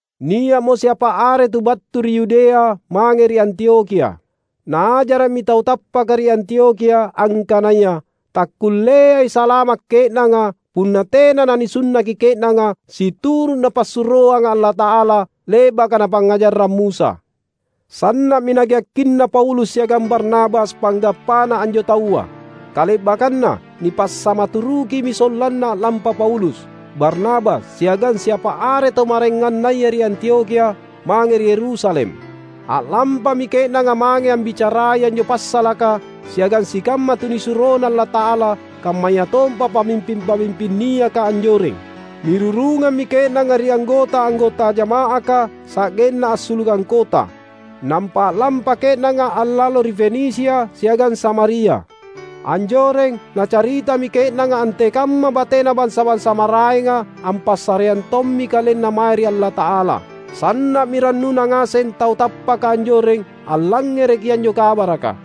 Nia’mo siapa are tu battu ri Yudea mange ri Antiokhia. Naajara’mi tau tappaka ri Antiokhia angkanaya takkulleai salama’ ke’nanga, punna tena nanisunnaki ke’nanga situru’ Napassuroanga Allata’ala, le’baka napangngajarrang Musa. Sanna’mi nageakkinna Paulus siagang Barnabas panggappana anjo taua. Kale’bakkanna nipassamaturukimi sollanna a’lampa Paulus, Barnabas, siagang siapa are tau maraengannaya ri Antiokhia, mange ri Yerusalem. A’lampami ke’nanga mange ambicarai anjo passalaka siagang sikamma tunisuroNa Allata’ala kammayatompa pamimping-pamimping niaka anjoreng. Nirurungammi ke’nanga ri anggota-anggota jama’aka sa’genna assulukang kota. Nampa a’lampa ke’nanga allalo ri Fenisia siagang Samaria. Anjoreng, nacaritami ke’nanga antekamma batena bansa-bansa maraenga ampassareang tommi kalenna mae ri Allata’ala. Sanna’mi rannuna ngaseng tau tappaka anjoreng allangngereki anjo kabaraka.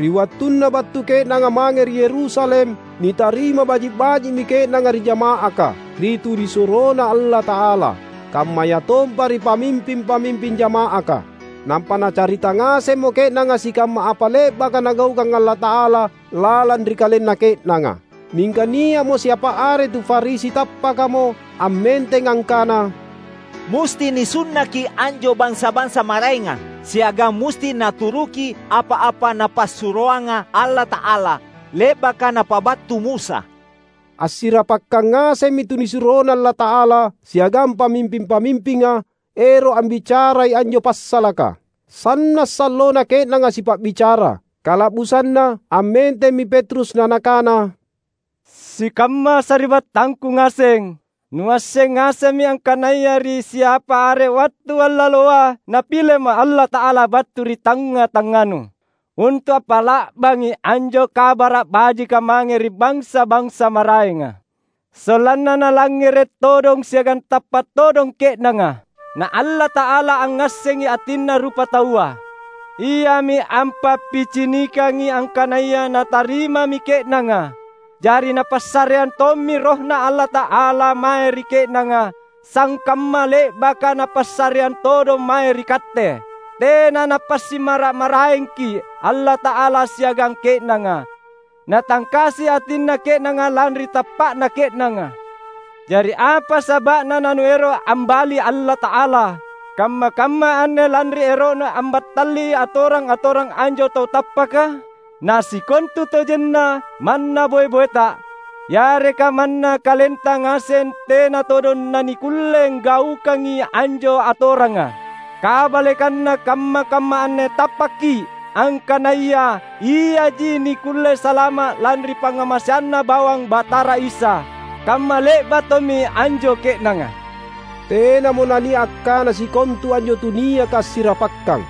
Ri wattunna battu ke’nanga mange ri Yerusalem, nitarima baji’-baji’mi ke’nanga ri jama’aka, ri tunisuroNa Allata’ala, kammayatompa ri pamimping-pamimping jama’aka. Nampa nacarita ngasemmo ke’nanga sikamma apa le’baka Nagaukang Allata’ala lalang ri kalenna ke’nanga. Mingka nia’mo siapa are tu Farisi tappakamo, ammenteng angkana, "Musti nisunnaki anjo bansa-bansa maraenga, siagang musti naturuki apa-apa napassuroanga Allata’ala, le’baka napabattu Musa." Assirapakkang ngasemmi tunisuroNa Allata’ala siagang pamimping-pamimpinga, ero’ ambicarai anjo passalaka. Sanna’ sallona ke’nanga sipa’bicara. Kala’busanna ammentemmi Petrus na nakana, "Sikamma sari’battangku ngaseng! Nuasseng ngasemmi angkanaya ri siapa are wattu allaloa Napilema’ Allata’ala battu ri tangnga-tangnganu, untu’ ampa’la’bangi anjo Kabara’ Bajika mange ri bansa-bansa maraenga, sollanna nalangngere’ todong siagang tappa’ todong ke’nanga. Na Allata’ala angngassengi atinna rupataua. Iami ampappicinikangi angkanaya Natarimami ke’nanga. Jari Napassareang tommi RohNa Allata’ala mae ri ke’nanga, sangkamma le’baka Napassareang todong mae ri katte. Tena Napasimmara’-maraengki’ Allata’ala siagang ke’nanga. Natangkasi atinna ke’nanga, lanri tappa’na ke’nanga. Jari apa saba’na nanuero’ ambali Allata’ala kamma-kamma anne lanri ero’nu ambattali atorang-atorang anjo tau tappaka? Na sikontutojenna manna boe-boeta, yareka manna kalenta ngaseng tena todong nanikkulle anggaukangi anjo atoranga. Kabalekanna, kamma-kamma anne tappakki’, angkanaya iaji nikkulle salama’ lanri pangngamaseanNa bawang Batara Isa; kamma le’ba’ tommi anjo ke’nanga." Tenamo nania’ akkana sikontu anjo tuniaka assirapakkang.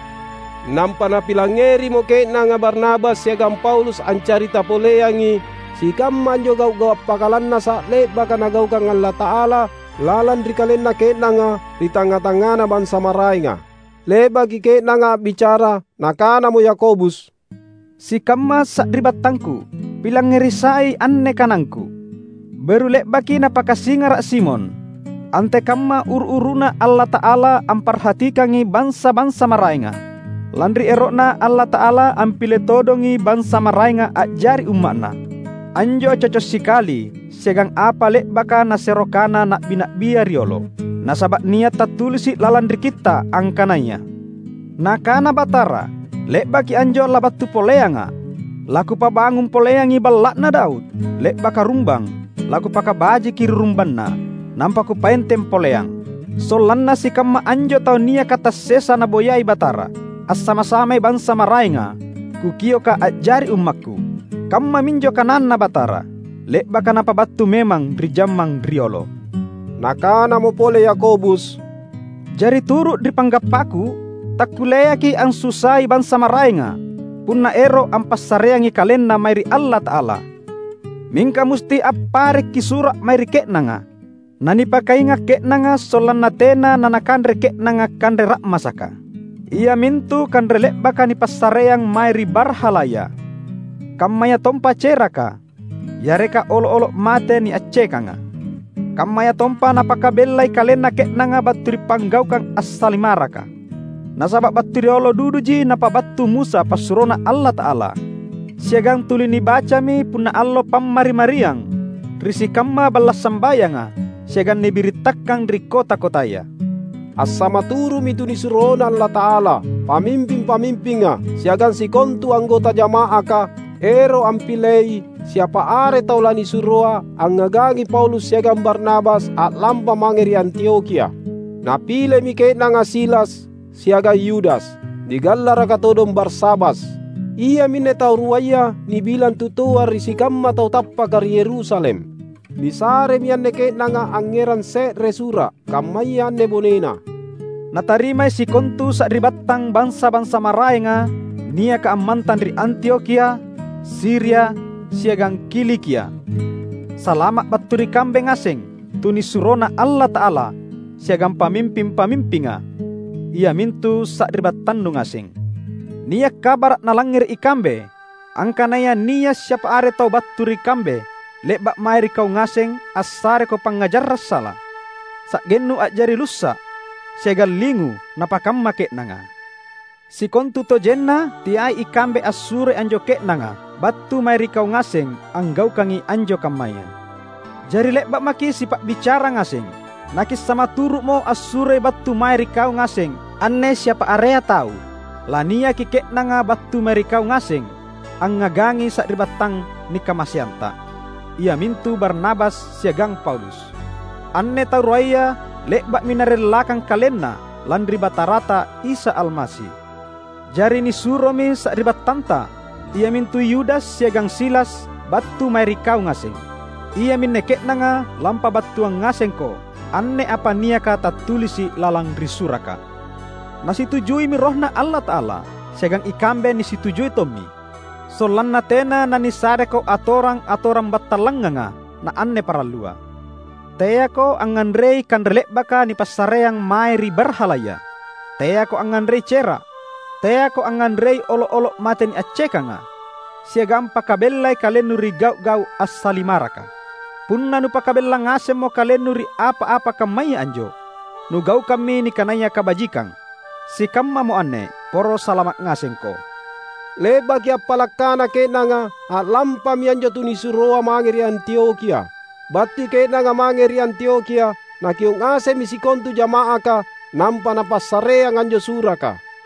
Nampa napilangngerimo ke’nanga Barnabas siagang Paulus ancarita poleangi sikamma anjo gau’-gau’ appakalannasa’ le’baka Nagaukang Allata’ala lalang ri kalenna ke’nanga ri tangnga-tangngana bansa maraenga. Le’baki ke’nanga a’bicara, nakanamo Yakobus, "Sikamma sari’battangku! Pilangngeri sai anne kanangku. Beru le’baki napakasingara’ Simon, antekamma uru-uruna Allata’ala amparhatikangi bansa-bansa maraenga, lanri ero’Na Allata’ala ampile todongi bansa maraenga a’jari umma’Na. Anjo coco’ sikali siagang apa le’baka nasero kana na’bi-na’bia riolo. Nasaba’ nia’ tattulisi’ lalang ri Kitta’ angkanaya, Nakana Batara, ‘Le’baki anjo labattu poleangA’, laKupabangung poleangi balla’na Daud, le’baka rumbang laKupakabajiki ri rumbanna, nampa Kupaenteng poleang; sollanna sikamma anjo tau niaka tassesa naboyai Batara, assama-samai bansa maraenga, Kukioka a’jari ummakKu.’ Kammaminjo kananNa Batara, le’baka Napabattu memang ri jammang riolo." Nakanamo pole Yakobus, "Jari turu’ ri panggappaku, takkulleaki’ ansusai bansa maraenga, punna ero’ ampassareangi kalenna mae ri Allata’ala. Mingka musti apparekki’ sura’ mae ri ke’nanga, na nipakainga’ ke’nanga sollanna tena nanakanre ke’nanga kanre ra’masaka, iamintu kanre le’baka nipassareang mae ri barhalaya; kammayatompa ceraka, yareka olo’-olo’ mate niaccekanga. Kammayatompa napakabellai kalenna ke’nanga battu ri panggaukang assalimaraka. Nasaba’ battu riolo duduji napabattu Musa passuroNa Allata’ala, siagang tuli nibacami punna allo Pammari-mariang ri sikamma balla’ sambayanga siagang nibirittakang ri kota-kotaya." Assamaturu’mi tunisuroNa Allata’ala, pamimping-pamimpinga, siagang sikontu anggota jama’aka, ero’ ampilei siapa are tau lanisuroa angngagangi Paulus siagang Barnabas a’lampa mange ri Antiokhia. Napilemi ke’nanga Silas siagang Yudas, nigallaraka todong Barsabas. Iaminne tau ruaya nibilang tutoa ri sikamma tau tappaka ri Yerusalem. Nisaremi anne ke’nanga angngerang se’re sura’, kammaya anne bonena, "Natarimai sikontu sari’battang bansa-bansa maraenga, niaka ammantang ri Antiokhia, Siria, siagang Kilikia. Salama’ battu ri kambe ngaseng tunisuroNa Allata’ala siagang pamimping-pamimpinga, iamintu sari’battannu ngaseng. Nia’ kabara’ nalangngere’ ikambe angkanaya nia’ siapa are tau battu ri kambe le’ba’ mae ri kau ngaseng assareko pangngajarang sala, sa’gennu a’jari lussa’ siagang lingu napakamma ke’nanga. Sikontutojenna teai ikambe assuroi anjo ke’nanga battu mae ri kau ngaseng anggaukangi anjo kammaya. Jari le’ba’ maki’ sipa’bicara ngaseng, nakissamaturu’mo assuroi battu mae ri kau ngaseng anne siapa area tau. Laniaki ke’nanga battu mae ri kau ngaseng angngagangi sari’battang nikamaseanta, iamintu Barnabas siagang Paulus. Anne tau ruaya le’ba’mi narellakang kalenna lanri Batarata Isa Almasi. Jari nisuromi sari’battanta iamintu Yudas siagang Silas battu mae ri kau ngaseng. Iaminne ke’nanga lampabattuang ngasengko anne apa niaka tattulisi’ lalang ri suraka. Nasitujuimi RohNa Allata’ala — siagang ikambe nisitujui tommi — sollanna tena nanisareko atorang-atorang battallanganga na anne parallua: teako angnganrei kanre le’baka nipassareang mae ri barhalaya; teako angnganrei cera’, teako angnganrei olo’-olo’ mate niaccekanga, siagang pakabellai kalennu ri gau’-gau’ assalimaraka. Punna nupakabella ngasemmo kalennu ri apa-apa kammaya anjo, nugaukammi nikanaya kabajikang. Sikammamo anne, poro salama’ ngasengko!" Le’baki appala’ kana ke’nanga, a’lampami anjo tunisuroa mange ri Antiokhia. Battui ke’nanga mange ri Antiokhia, nakio’ ngasemmi sikontu jama’aka nampa napassareang anjo suraka.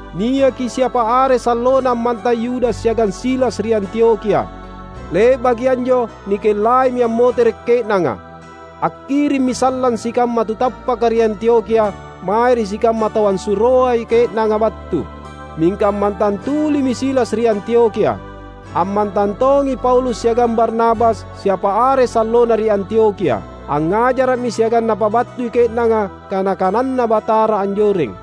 Niaki siapa are sallona ammantang Yudas siagang Silas ri Antiokhia. Le’baki anjo nikellaimi ammotere’ ke’nanga. Akkirimmi sallang sikamma tu tappaka ri Antiokhia mae ri sikamma tau assuroai ke’nanga battu. [Mingka ammantang tulimi Silas ri Antiokhia.] Ammantang tongi Paulus siagang Barnabas siapa are sallona ri Antiokhia. Angngajara’mi siagang napabattui ke’nanga kana-kananNa Batara anjoreng.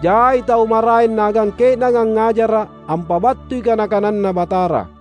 Jai tau maraeng naagang ke’nanga angngajara’ ampabattui kana-kananNa Batara.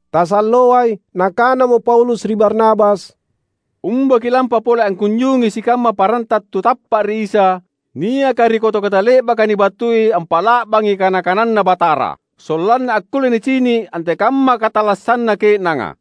Tasalloai, nakanamo Paulus ri Barnabas, "Umba ki’lampa pole angkunjungi sikamma paranta tu tappa’ ri Isa niaka ri kota-kota le’baka nibattui ampa’la’bangi kana-kananNa Batara; sollanna akkulle nicini’ antekamma katallassanna ke’nanga."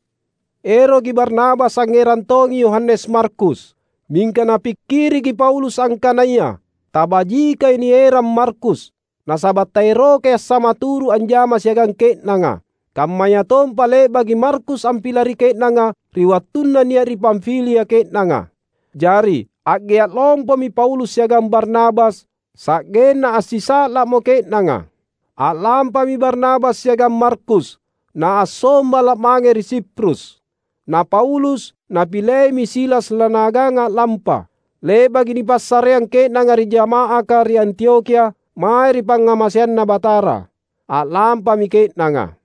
Eroki Barnabas angngerang tongi Yohanes Markus, Mingka napikkiriki Paulus angkanaya tabajikai nierang Markus; nasaba’ taerokai assamaturu’ anjama siagang ke’nanga, kammayatompa le’baki Markus ampilari ke’nanga ri wattunna nia’ ri Pamfilia ke’nanga. Jari a’gea’ lompomi Paulus siagang Barnabas sa’genna assisa’la’mo ke’nanga: A’lampami Barnabas siagang Markus, na assombala’ mange ri Siprus. Na Paulus napileimi Silas lanaagang a’lampa. Le’baki nipassareang ke’nanga ri jama’aka ri Antiokhia mae ri pangngamaseanNa Batara, a’lampami ke’nanga.